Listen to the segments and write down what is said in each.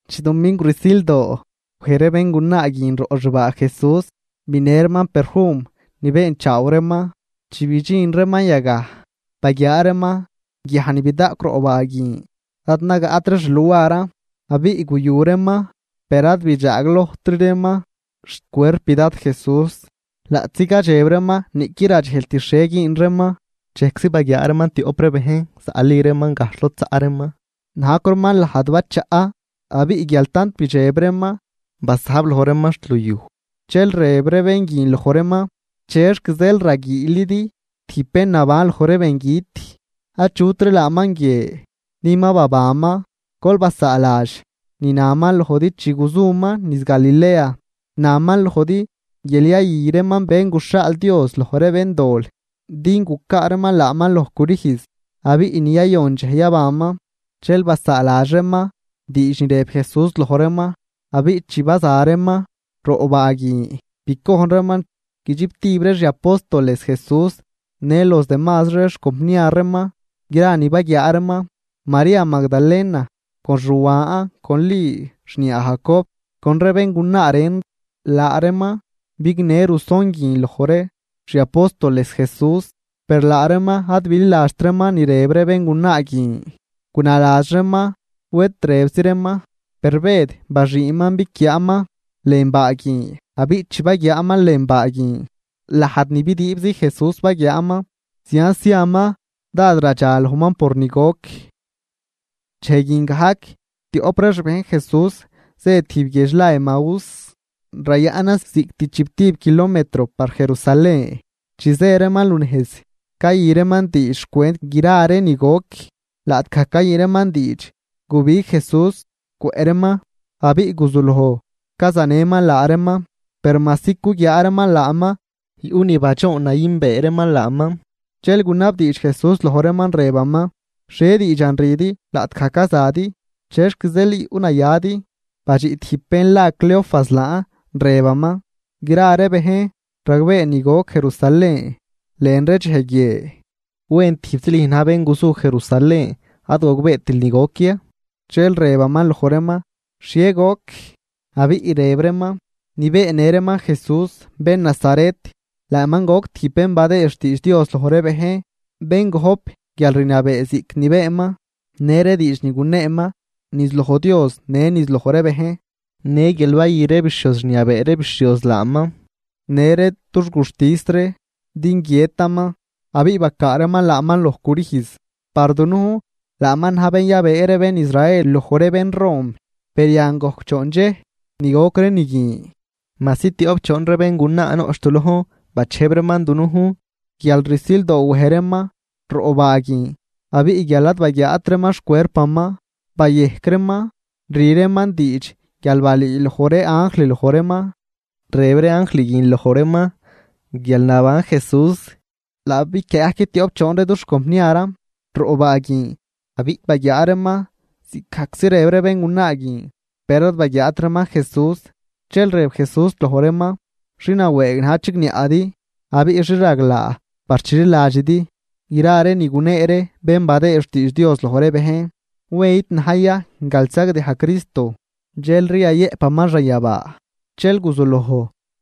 Chi dumingw rsildoo, wej ree béngunaa guin roꞌ xbaa Jesús binë reeman perfum ni beenchaaw reeman. Chi bidxin reeman yagaj, baguiaa reeman guiaj ni bidaꞌcw roꞌ baa guin ad nagaꞌtri xluaran. Abiꞌ guyu reeman, per ad bidxaaglojtri reeman xcuerp Dad Jesús. Laꞌtzi cadxeb reeman niꞌquid radxejlt xhie güün reeman, dxejczi baguiaa reeman tioꞌp ree bejn zaꞌli reeman gajxh lod zaꞌ reeman, najcw reeman lajd bachaꞌ. Abiꞌ guial tant bidxeb reeman, basajb loj reeman xt luyuj, dxel rëb ree bén guin loj reeman; ―¿Chexc zeel raguiilidi tijb bén naban loj ree bengüt? Achutri laaman guie din ma babanman. Gol basaaladx ni naman lojdi chi guzuman niz Galilea. Naman lojdi guial yayü reeman Bén guxhaal Dios loj ree béndol din gucaa reeman laaman loj crüjz, abiꞌ ni yayon dxej yabanman. Dxel basaaladx reeman diidx ni rëb Jesús loj reeman, abiꞌ chi baza reeman roꞌ baa guin, bicojn reeman guidxiptib ree xi apóstoles Jesús në los demazri ree xcompniar reeman gra ni baguiaa reeman. María Magdalena, con Xuan, con Li xniaa Jacob con ree béngunaa ren, laa reeman bignë ruson guin loj ree xi apóstoles Jesús. Per laa reeman ad bililadxt reeman ni rëb ree béngunaa guin, gunaladx reeman wed rëbzi reeman. Per Bëd baxüünman biquiaaman lën baa guin, abiꞌ chi baguiaaman lën baa guin, lajd ni bidüübzi Jesús baguiaaman, zianz ziaman dád radxalojman por ni goc. Dxej guin gajc, tioꞌp ree xbejn Jesús zë tijb guiedx la Emaús, rayaꞌnan ziꞌct chiptib kilometro par Jerusalén. Chi zë reeman lunejz cayü reeman diidx xcwent gra ree ni goc. Laꞌtgaj cayü reeman diidx, gubig Jesús cwëꞌ reeman abiꞌ guzuloj cazanëman laa reeman. Per majsi cuguiaa reeman laaman, yuꞌ ni badxoon nayünbee reeman laaman. Dxel gunabdiidx Jesús loj reeman, rëbaman: ―¿Xhie diidxan rüdi laꞌtgaj cazadi? ¿Chexc zeel yuꞌnayadi? Badxiꞌ tijb bén la Cleofas laan, rëbaman: ―Gra ree bejn ragbee ni goc Jerusalén lën ree dxej guie. ¿Wen tijbzi lüj na̱j bén guzu Jerusalén ad gogbeetil ni goc ya? Dxel rëbaman loj reeman: ―¿Xhie goc? Abiꞌ rëb reeman: ―Ni beennë reeman Jesús bén Nazaret, laaman goc tijb bén badëë xtiidx Dios loj ree bejn, bén gop guialrniabee ziꞌc ni beenman në ree diidx ni guneeman niz loj Dios në niz loj ree bejn. Në guial bayü ree bixhioz rniabee ree bixhioz laaman në ree dux guxtis ree din guiëtaman, abiꞌ bacaa reeman laaman loj crüjz. Par dunujn laaman na̱j bén yabëë ree bén Israel loj ree bén rom, per yan gojc choon dxej ni goc ree ni guin. Majsi tioꞌp choon ree béngunaa noꞌch du lojn bachejb reeman dunujn, guial rsildoo wej reeman roꞌ baa guin, abiꞌ guial ad baguiaat reeman xcuerpaman, bayejc reeman rü reeman diidx guial balüüloj ree anjl loj reeman, rëb ree anjl guin loj reeman guial naban Jesús. Laa biquiaa gajc ree tioꞌp choon ree dux compniaran roꞌ baa guin abiꞌ baguiaa reeman ziꞌcgajczi rëb ree béngunaa guin, per ad baguiaat reeman Jesús. Dxel rëb Jesús loj reeman: ―¡Xi nawëëg na̱j chigniaꞌdi abiꞌ xi raglaa par chililadxidi gra ni gunee ree bén badëë xtiidx Dios loj ree bejn! ¿Wen id na̱j ya guial sagdiaj Cristo, dxelri yayëꞌpaman xanyabaa? Dxel guzuloj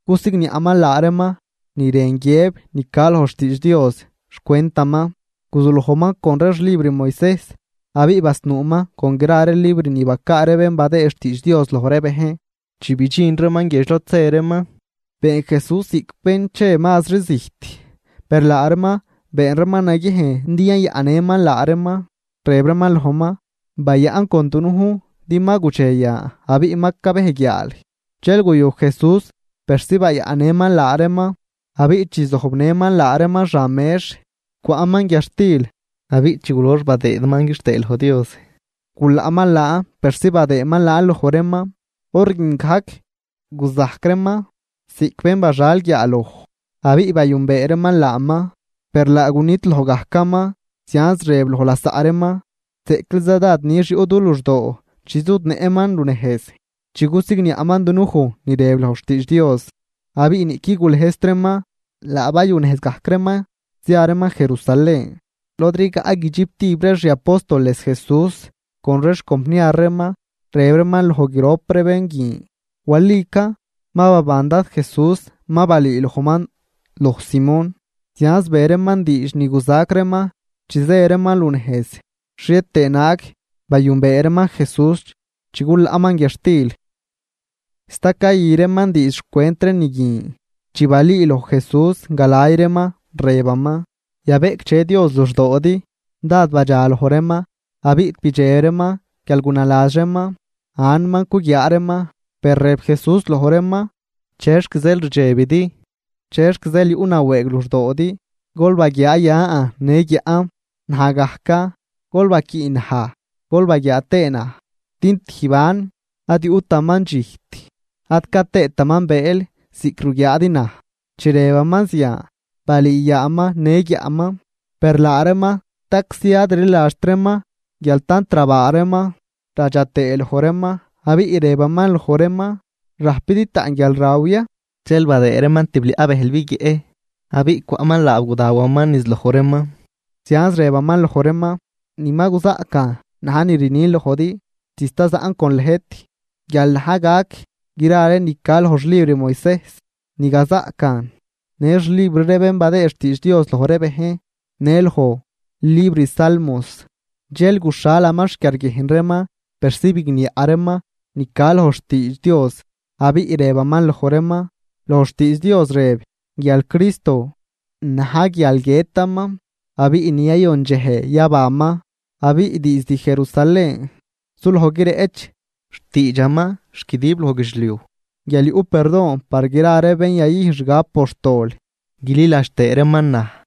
cusigniaꞌman laa reeman ni rën guiëb ni ca loj xtiidx Dios xcwentaman. Guzulojman con ree xlibr Moisejs abiꞌ basnuuman con gra ree libr ni bacaa ree bén badëë xtiidx Dios loj ree bejn. Chi bidxin reeman guiedx lod zë reeman, been Jesús ziꞌc bén che mazri zijt. Per laa reeman been reeman naguiejn din yayaꞌnnëman laa reeman, rëb reeman lojman: ―Bayaꞌn con dunujn, din ma gudxe yan abiꞌ ma cabej guiaal. Dxel guyu Jesús persi bayaꞌnnëman laa reeman. Abiꞌ chi zojbnëman laa reeman xan mex, cwaꞌman guiadxtil abiꞌ chi gulox badëëman quixtëë loj Dios, gulaꞌman laan persi badëëman laan loj reeman. Hor guin gajc guzajc reeman ziꞌc bén baxal guiaaloj, abiꞌ bayünbee reeman laaman. Per laa gunidloj gajcaman, zianz rëb loj lasaꞌ reeman: ―¡Zeꞌcliza dád nix yuꞌ du luxdoo chi zudnëꞌman lunejz, chi cusigniaꞌman dunuj ni rëb loj xtiidx Dios! Abiꞌ niꞌquid gulëjzt reeman, laa bayunejz gajc reeman zia reeman Jerusalén lod rigaꞌ guidxiptib ree xi apóstoles Jesús con ree xcompniar reeman. Rëb reeman loj grop ree bén guin: ―Walican ma baban Dad Jesús, ma balüülojman loj Simón. Zianz be reeman diidx ni guzac reeman chi zë reeman lunejz xhie tëë naag bayünbee reeman Jesús chi gulaꞌman guiadxtil. Sta cayü reeman diidx xcwent ree ni guin, chi balüüloj Jesús galay reeman, rëbaman: ―Yabeꞌcdxe Dios luxdoodi. Dád badxaloj reeman abiꞌ bidxeb reeman guial gunaladx reeman anman cuguiaa reeman. Per rëb Jesús loj reeman: ―¿Chexc zeel rdxebidi? ¿Chexc zeel yuꞌnawëëg luxdoodi? Gol baguiaa yan në guiaꞌn. Naj gajcan, gol baquiꞌ naj gol baguiaa tëë naj, din tijb anm ad yuꞌtaman dxijt ad ca tëëtaman bëël ziꞌc ruguiaadi naj. Chi rëbaman zian, balüü yaaman në guiaꞌman. Per laa reeman staczi ad rliladxt reeman guial tant rabaa reeman radxa tëë loj reeman, abiꞌ rëbaman loj reeman: ―¿Rajpidi taꞌn guialraw ya? Dxel badëë reeman tibliaꞌ bëjl biguieꞌ, abiꞌ cwaꞌman laab gudawaman niz loj reeman. Zianz rëbaman loj reeman: ―Ni ma guzaꞌcan na̱j ni rnin lojdi chi sta zaꞌn con lëjt: Guial na̱j gac gra ree ni ca loj xlibr Moisejs ni gazaꞌcan, në xlibr ree bén badëë xtiidx Dios loj ree bejn, në loj libr salmos. Dxel guxhalaman xquiarguiejn reeman persi bigniaꞌ reeman ni ca loj xtiidx Dios, abiꞌ rëbaman loj reeman: ―Loj xtiidx Dios rëb guial Cristo, na̱j guial guiëtaman, abiꞌ ni yayon dxej yabanman. Abiꞌ diizd Jerusalén suloj guireꞌch xtiidxaman xt guidib loj guidxliuj guial yuꞌ perdon par gra ree bén yayüjn xgab por xtol guililadx tëë reeman naj.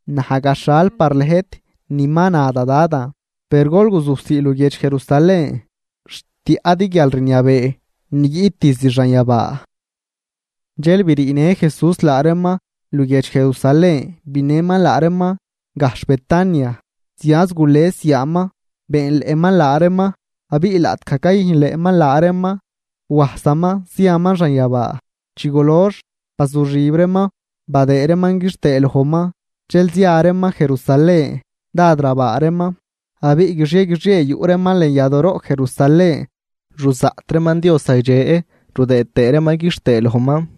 Naj gaxhal par lëjt ni ma na da Dadan. Per gol guzujsii luguiedx Jerusalén xt tiaꞌdi guialrniabee ni guiꞌt diizd xanyabaa. Dxel briinë Jesús laa reeman luguiedx Jerusalén binëman laa reeman gajxh Betania, zianz gules yaaman beenleꞌman laa reeman. Abiꞌ laꞌtgaj cayüjnleꞌman laa reeman, wajsaman ziaman xanyabaa. Chi gulox bazuxib reeman badëë reeman quixtëë lojman, dxel zia reeman Jerusalén, dád rabaa reeman. Abiꞌ guixie guixie yuꞌ reeman lën yadooroꞌ Jerusalén ruzaꞌt reeman Dios zagdxe rudëëd tëë reeman quixtëë lojman.